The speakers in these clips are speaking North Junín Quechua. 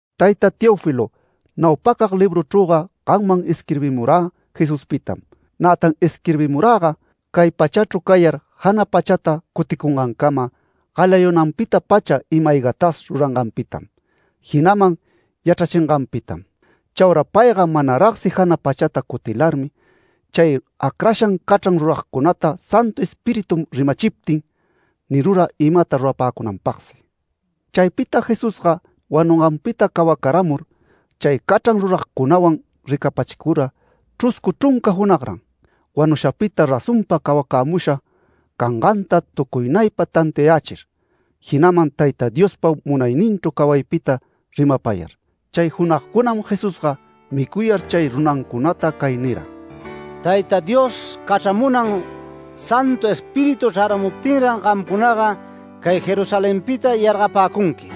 Tayta Teófilo, naupacag libruchrüga gamman isquirbimurä Jesuspitam, nätan isquirbimuräga cay pachachru cayar jana pachata cuticungancama galayunanpita-pacha ima-aygatas ruranganpitam, jinaman yachrachinganpitam. Chaura payga manaragsi jana pachata cutilarmi, chay acrashan cachran ruragcunata Santu Espíritu rimachiptin nirura imata rurapäcunanpagsi. Chaypita Jesusga wanunganpita cawacaramur, chay cachran ruragcunawan ricapachicura chruscu chrunca junagran, wanushapita razonpa cawacämusha canganta tucuynaypa tantiayächir, jinaman Tayta Diospa munayninchru cawaypita rimapayar. Chay junagcunam Jesusga micuyar chay runancunata cay nira: “Tayta Dios cachramunan Santu Espíritu chraramuptinran gamcunaga cay Jerusalenpita yargapäcunqui,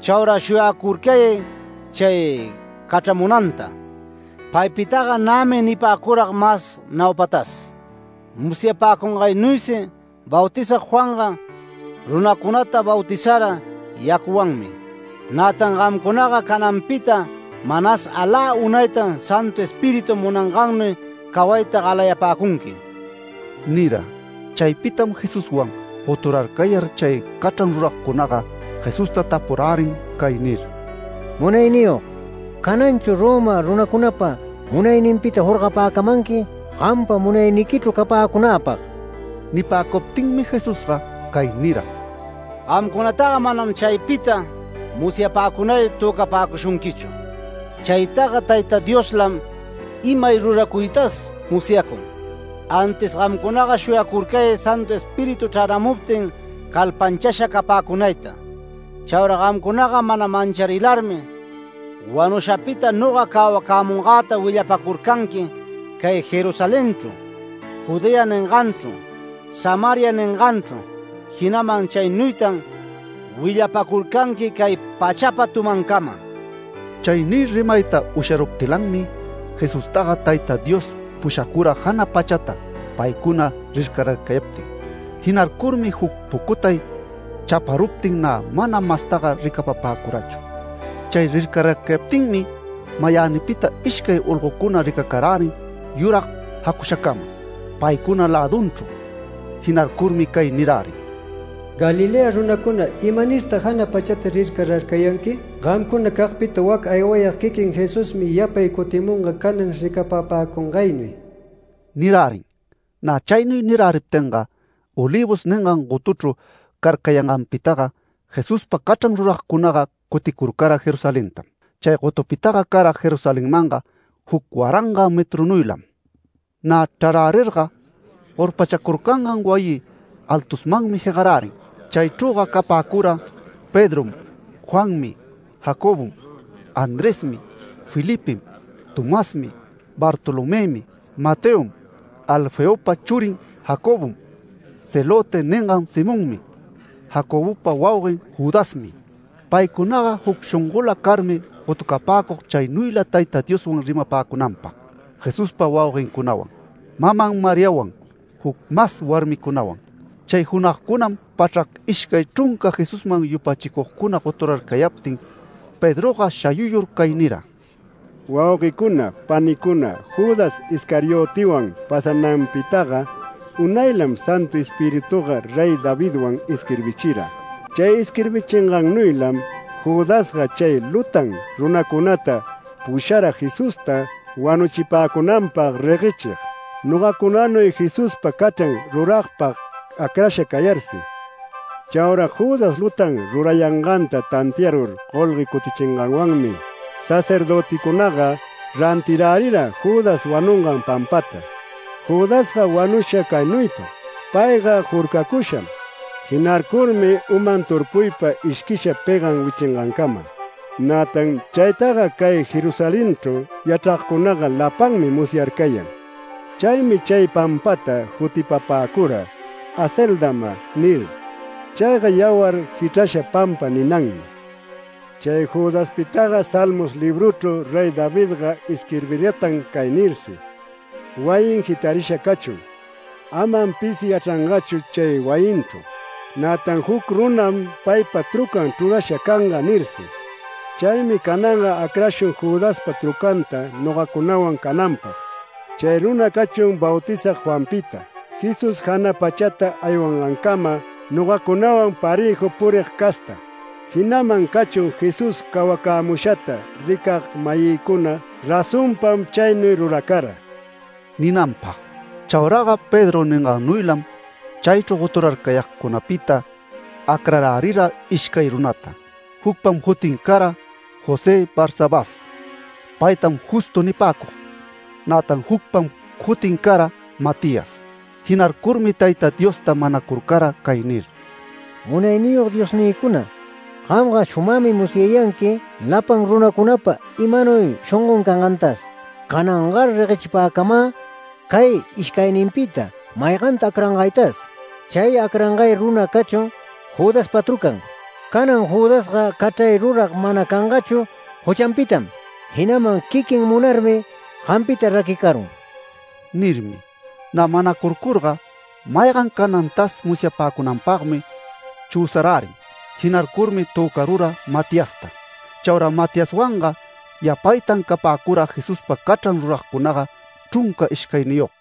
chaura shuyacurcayay chay cachramunanta. Paypitaga nämi nipäcurag mas naupatas. Musyapäcungaynuysi Bautizag Juanga runacunata bautizara yacuwanmi. Nätan gamcunaga cananpita manas alä unaytam Santu Espíritu munangannuy cawayta galayapäcunqui” nira. Chaypitam Jesuswan goturarcayar chay cachran ruragcunaga Jesusta tapurärin cay nir: “Munayniyog, ¿cananchu Roma runacunapa munayninpita jorgapäcamanqui gampa munayniquichru capäcunäpag?” Nipäcuptinmi Jesusga cay nira: “Gamcunataga manam chaypita musyapäcunay töcapäcushunquichu. Chaytaga Tayta Dioslam imay ruracuytas musyacun. Antis gamcunaga shuyacurcayay Santu Espíritu chrämuptin calpanchasha capäcunayta. Chaura gamcunaga mana mancharilarmi wanushapita noga cawamungäta willapacurcanqui cay Jerusalenchru, Judea ninganchru, Samaria ninganchru, jinaman chaynuytan willapacurcanqui cay pachapa tumancama”. Chay nir rimayta usharuptilanmi, Jesustaga Tayta Dios pushacura jana pachata paycuna rircararcayaptin. Jinarcurmi juc pucutay chaparuptin nä mana mastaga ricapapäcurachu. Chay rircararcayaptinmi mayänipita ishcay olgocuna ricacarärin yurag jacushacama paycuna lädunchru. Jinarcurmi cay nirärin: “Galilea runacuna, ¿imanirtag jana pachata rircararcayanqui? Gamcunacagpita wac aywayag quiquin Jesusmi yapay cutimunga canan ricapapäcungaynuy” nirärin. Nä chaynuy niräriptinga, Olivos ningan gotuchru carcayanganpitaga Jesuspa cachran ruragcunaga cuticurcara Jerusalentam. Chay gotupitaga cara Jerusalenmanga juc waranga metrunuylam. Nä chrarärirga, gorpachacurcangan wayi altusmanmi jegarärin. Chaychrüga capäcura Pedrom, Juanmi, Jacobom, Andresmi, Felipem, Tomasmi, Bartolomëmi, Mateom, Alfeopa churin Jacobom, ‘Celote’ ningan Simonmi, Jacobopa wauguen Judasmi. Paycunaga juc shongola carmi gotucapäcug chaynuyla Tayta Dioswan rimapäcunanpag, Jesuspa wauguencunawan, maman Mariawan, juc mas warmicunawan. Chay junagcunam pachrac ishcay chrunca Jesusman yupachicugcuna goturarcayaptin Pedroga shayuyur cay nira: “Wauguecuna, panicuna, Judas Iscariotewan pasananpitaga unaylam Santu Espirituga Rey Davidwan isquirbichira. Chay isquirbingannuylam Judasga chay lutan runacunata pushara Jesusta wanuchipäcunanpag reguechig, nogacunanuy Jesuspa cachran ruragpag acrasha cayarsi. Chaura Judas lutan rurayanganta tantiarur golgue cutichinganwanmi, sacerdöticunaga rantirärira Judas wanungan pampata. Judasga wanusha caynuypam: Payga jurcacusham. Jinarcurmi uman turpuypa ishquisha pegan wichangancama. Nätan chaytaga cay Jerusalenchru yachragcunaga lapanmi musyarcayan. Chaymi chay pampata jutipapäcura ‘Acéldama’ nir. Chayga ‘Yawar jichrasha pampa’ ninanmi. Chay Judaspitaga Salmos libruchru Rey Davidga isquirbiratan cay nirsi: ‘Wayin jitarisha cachun. Amam pisi yachrangachu chay wayinchru, nätan juc runam paypa trucan chrurasha canga’ nirsi. Chaymi cananga acrashun Judaspa trucanta nogacunawan cananpag. Chay runa cachun Bautizag Juanpita, Jesús jana pachata aywangancama nogacunawan parëju purig casta, jinaman cachun Jesús cawacämushata ricag-mayïcuna razonpam chaynuy ruracara” ninanpag. Chauraga Pedro ningannuylam chaychru goturarcayagcunapita acrarärira ishcay runata. Jucpam jutin cara José Barsabás. Paytam Justo nipäcug. Nätan jucpam jutin cara Matías. Jinarcurmi Tayta Diosta manacurcara cay nir: “Munayniyog Diosnïcuna, gamga shumagmi musyayanqui lapan runacunapa imanuy shongon cangantas. Canangar reguechipäcamä cay ishcayninpita mayganta acrangaytas. Chay acrangay runa cachun Judaspa trucan. Canan Judasga cachray rurag mana cangachu juchanpitam, jinaman quiquin munarmi gampita raquicarun” nirmi. Nä manacurcurga maygan canantas musyapäcunanpagmi chüsarärin. Jinarcurmi töcarura Matiasta. Chaura Matiaswanga yapaytan capäcura Jesuspa cachran ruragcunaga chrunca ishcayniyog.